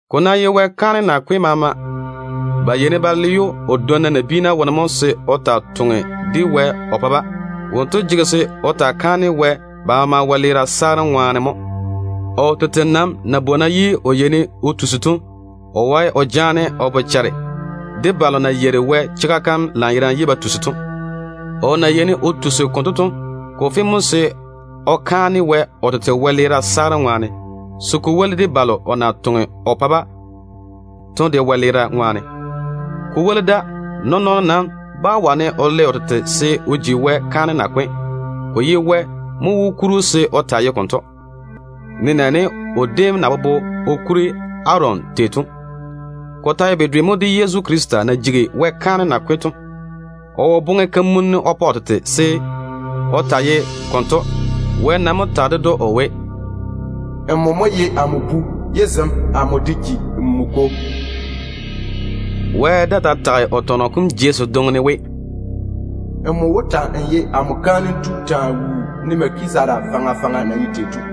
Ko ná ye Wɛ kaanem nakwe tu maama, ba yeini ba le‑o o dwonna nabiina wone mo se o taa toŋe o pa-ba Wɛ chwoŋa tɔgem seeni. Wonto jege se o taa kaane Wɛ ba maama wɛleera saarem ŋwaane mo. O tete nam na bwona ye o yeini o tusi to, o wae o jaane o bochare de balo na yeiri Wɛ chega kam lanyerane ye ba tusi to. O na bwona konto to, ko fe mo se o kaane Wɛ o tete wɛleera saarem ŋwaane, se ko woli de balo o na toŋe o pa-ba to de wɛleera ŋwaane. Nɔɔn-nɔɔno nam bá wane o le o tete se o ji Wɛ kaanem nakwe tu. Ko ye Wɛ mo wó kuri‑o se o taa ye konto, nenɛɛne o déem na bobo o kuri Aron tei to. Ko ta ye bedwe mo de Yezu Krista na jigi Wɛ kaanem nakwe tu to. O wo boŋe kamunim o pa o tete se o taa ye konto. Wɛ nam mo tage ded‑o o we: “Nmo mo ye amo Bu, ye zem amo de ji nmo Kwo.” Wɛ daa ta tage o tɔnɔ kom jei sedwoŋi ne we: “Nmo wó ta‑n ye amo kaanem tu taa wuu, ne Melkizedeka na ye tei faŋa faŋa to.”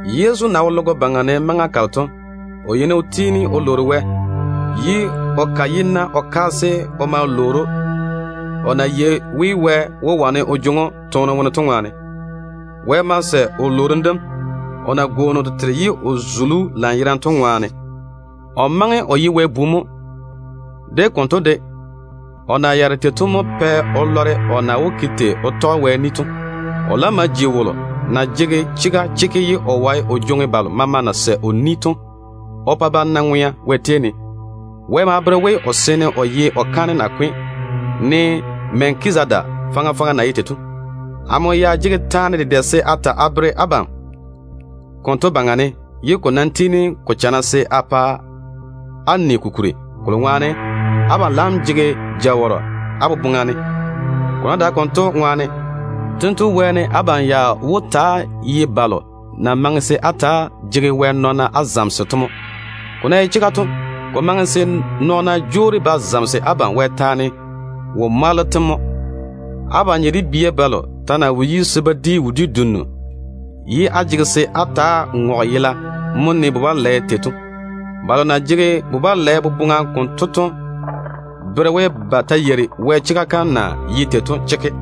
Yezu na wo logo baŋa ne maŋa kalo to, o yeini o tiini o ware Wɛ, ye o ka yi-na o kaase o ma lwoori‑o, o na yei we Wɛ wó wane o jwoŋi‑o toone wone to ŋwaane. Wɛ ma sɛ o wɛ-lworo kom, o na tu o tete ye o zuli‑o lanyerane to ŋwaane. O maŋe o ye Wɛ Bu mo. De konto de, o na yaare tei to mo pɛ o lɔre o na wó ke tei o tɔge Wɛ ni to. O laam ma ji wolo na jege chega chekke ye o wae o jwoŋi balo maama na sɛ o ni to o pa ba na ŋwea Wɛ tei ne. Wɛ ma le‑o se o taa ye o kaanem nakwe tu, ne Melkizedeka faŋa faŋa na ye tei to. Amo ya jege taane dedɛ se a ta a bere abam konto baŋa ne, ye ko nam tiini ko chana se a pa á ni ko kuri, kolo ŋwaane abam laam jege jawɔrɔ á boboŋa ne. Ko ná dae konto ŋwaane, tento wɛɛne abam ya wó ta‑á ye balo na maŋe se á ta‑á jege Wɛ nɔɔna á zamese to mo. Ko na ye chega to, ko maŋe se nɔɔna jwoori ba zamese abam Wɛ taane wo-mwaalo tem mo. Abam nye de bia balo ta na wo yi wodiu dim, ye á jege se á ta‑á ŋɔge yela mo ne bu-balɛ tei to. Balo na jege bu-balɛ boboŋa konto to bere we, ba ta wo lɔre Wɛ kwora kalo na bere o chega kam to chekke.